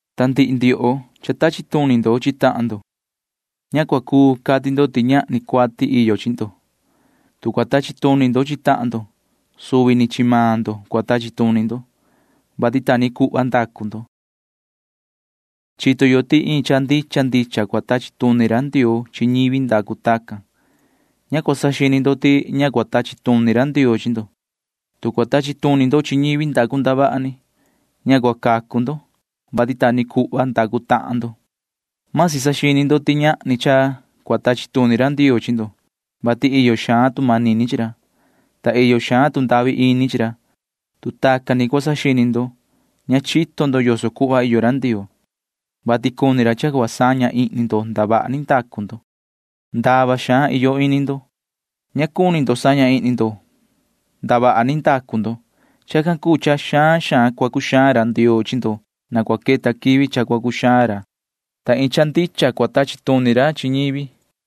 Ta ndihi ndioho, ndaa ndioho cua tachi tuni ndo chi tahan ndo―ña cua cuu cati ndo ti ñahni cuati iyo chi ndo. Tu cua tachi tuni ndo chi tahan ndo, suvi ni chi maan ndo cua tachi tuni ndo, vati ta ni cuhva ndacu ndo. Chito yo ti iin cha ndicha ndicha cua tachi tuni ra Ndioo chi ñivi ndacu tacan. Ña cua saxini ndo ti ña cua tachi tuni ra Ndioo chi ndo, tu cua tachi tuni ndo chi ñivi ndacu ndavaha ni. Ña cua cacu ndo, vati ta ni cuhva ndacu maan ndo. Vasi saxini ndo ti ñahni cha cua tachi tuni ra Ndioo chi ndo, vati iyo xaan tu manini chi ra, ta iyo xaan tu ndahvi ini chi ra. Tu tacan ni cua saxini ndo, ña chito ndo yoso cuhva iyo ra Ndioo, vati cuni ra cha cua saña ihni ndo ndavaha ni ndacu ndo. Ndava xaan iyo ini ndo. Ña cuni ndo saña ihni ndo ndavaha ni ndacu ndo. Chacan cuu cha xaan xaan cua cuxaan ra Ndioo chi ndo na cua queta quivi cha cua cuxaan ra, ta iin cha ndicha cua tachi tuni ra chi ñivi.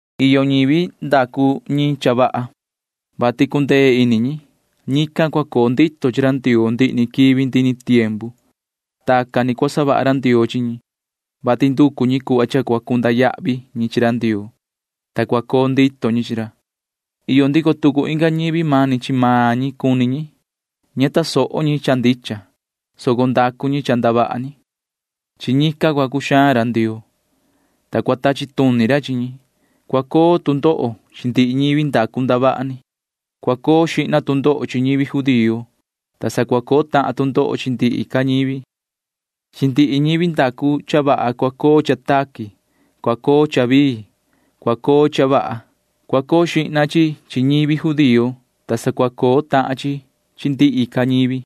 Iyo ñivi ndacu ñi cha vaha, vati cundee ini ñi. Ñican cua coo ndito ñi chi ra Ndioo ndihi ni quivi ndihi ni tiempu. Tacan ni cua savaha ra Ndioo chi ñi, vati nducu ñi cuhva cha cua cunda yahvi ñi chi ra Ndioo, ta cua coo ndito ñi chi ra. Iyo ndico tucu inga ñivi mani chi maan ñi cuni ñi. Ña tasoho ñi cha ndicha, soco ndacu ñi cha ndavaha ni. Chi ñican cua cuxaan ra Ndioo, ta cua tachi tuni ra chi ñi. Cua coo tu ndoho chi ndihi ñivi ndacu ndavaha ni. Cua coo xihna tu ndoho chi ñivi judío, ta sa cua coo tahan tu ndoho chi ndihi ca ñivi. Chi ndihi ñivi ndacu cha vaha cua coo cha taqui, cua coo cha vii, cua coo cha vaha. Cua coo xihna chi chi ñivi judío, ta sa cua coo tahan chi chi ndihi ca ñivi.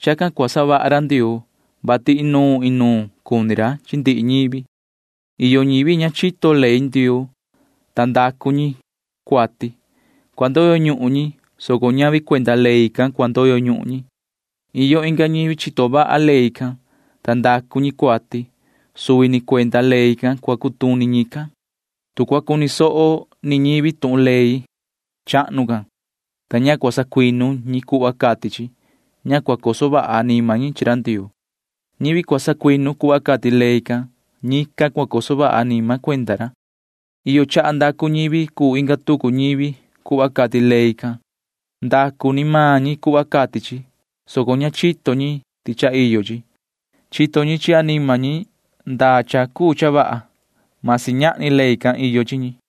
Chacan ni cua savaha ra Ndioo, vati inuun inuun cuni ra chi ndihi ñivi. Iyo ñivi ña chito ley Ndioo, ta ndacu ñi cuati. Cua ndoyo ñuhun ñi, soco ñavi cuenda ley can cua ndoyo ñuhun ñi. Iyo inga ñivi chito vaha ley can, ta ndacu ñi cuati. Suvi ni cuenda ley can cua cutuni ñican. Tu cua cuni soho ni ñivi tuhun ley chahnu can, ta ña cua sacuinu ñi cuhva cati chi, ña cua coso vaha anima ñi chi ra Ndioo. Ñivi cua sacuinu cuhva cati ley can, chi ñican cua coso vaha anima cuenda ra. Iyo chaha ndacu ñivi cuu inga tucu ñivi cuhva cati ley can. Ndacu ni maan ñi cuhva cati chi, soco ña chito ñi ti cha iyo chi. Chito ñi chi anima ñi ndaa cha cuu cha vaha―masi ñahni ley can iyo chi ñi.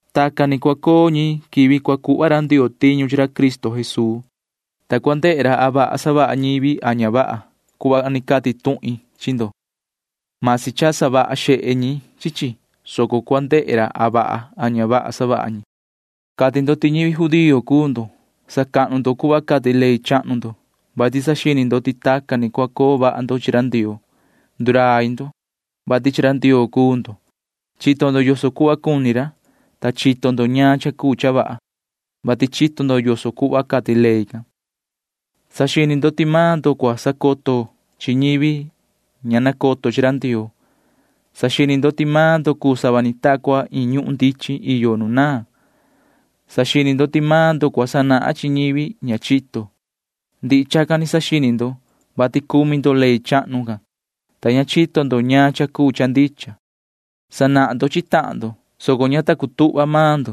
Tacan ni cua coo ñi quivi cua cuhva ra Ndioo tiñu chi ra Cristo Jesuu, ta cua ndehe ra a vaha savaha ñivi a ña vaha cuhva ni cati tuhin chi ndo. Masi cha savaha xehe ñi chi chi, soco cua ndehe ra a vaha a ña vaha savaha ñi. Cati ndo ti ñivi judío cuu ndo. Sacahnu ndo cuhva cati ley chahnu ndo, [vati saxini ndo ti tacan ni cua coo vaha ndo chi ra Ndioo]. Ndurai ndo, vati chi ra Ndioo cuu ndo. Chito ndo yoso cuhva cuni ra, ta chito ndo ñaan cha cuu cha vaha, vati chito ndo yoso cuhva cati ley can. Saxini ndo ti maan ndo cua sacoto chi ñivi ña nacoto chi ra Ndioo. Saxini ndo ti maan ndo cuu sava ni ta cua iin ñuhun ndichin iyo nu naan. Saxini ndo ti maan ndo cua sanahan chi ñivi ña chito. Ndihi chacan ni saxini ndo, vati cumi ndo ley chahnu can, ta chito ndo ñaan cha cuu cha ndicha. Sanahan ndo chi tahan ndo, soco ña ta cutuhva maan maan ndo.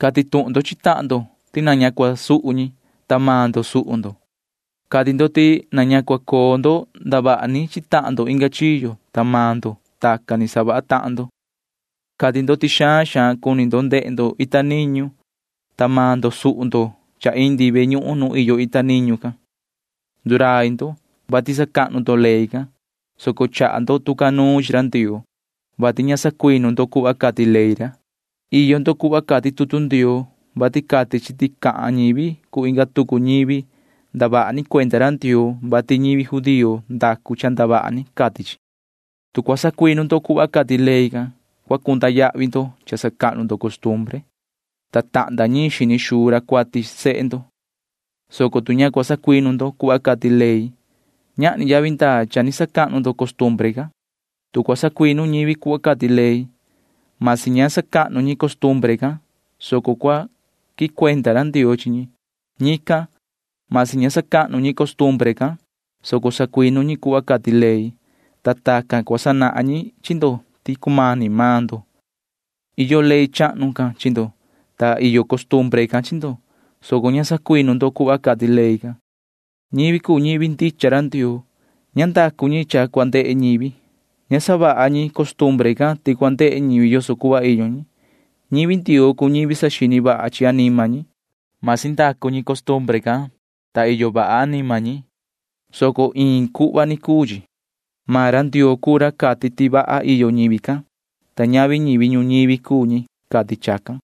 Cati tuhun ndo chi tahan ndo ti na ña cua suhu yo, ta maan ndo suhu ndo. Cati ndo ti na ña cua coo yo ndavaha ni chi tahan yo inga chiyo, ta maan ndo―tacan ni savaha tahan ndo. Cati ndo ti xaan xaan cuni yo ndehe yo ita niñu, ta maan ndo suhu ndo cha indi ve ñuhun nu iyo ita niñu can. Ndurai ndo, vati sacahnu ndo ley can, soco chaha ndo tu ca nuun chi ra Ndioo, vati ña sacuinu ndo cuhva cati ley ra. Iyo ndo cuhva cati tutu Ndioo, vati cati chi ti cahan ñivi cuu inga tucu ñivi ndavaha ni cuenda ra Ndioo, vati ñivi judío ndacu cha ndavaha ni, cati chi. Tu cua sacuinu ndo cuhva cati ley can, cua cunda yahvi ndo cha sacahnu ndo costumbre, ta tahnda ñiin xini xuu ra cuati sehe ndo, soco tu ña cua sacuinu ndo cuhva cati ley, ñahni yavi ndaa cha ni sacahnu ndo costumbre can. Tu cua sacuinu ñivi cuhva cati ley―masi ña sacahnu ñi costumbre can, soco cua quicuenda ra Ndioo chi ñi. Ñican―masi ña sacahnu ñi costumbre can, soco sacuinu ñi cuhva cati ley, ta tacan cua sanahan ñi chi ndo ti cumani maan ndo. Iyo ley chahnu can chi ndo, ta iyo costumbre can chi ndo, soco ña sacuinu ndo cuhva cati ley can. Ñivi cuu ñivi ndicha ra Ndioo―ña ndacu ñi cha cua ndehe ñivi. Ña savaha ñi costumbre can ti cua ndehe ñivi yoso cuhva iyo ñi. Ñivi Ndioo cuu ñivi saxini vaha chi anima ñi. Vasi savaha ñi costumbre can, vati iyo vaha anima ñi, soco iin cuhva cuu chi. Maan ra Ndioo cuu ra cati ti vaha iyo ñivi can, ta ñavi ñivi ñuñivi cuu ñi cati chacan.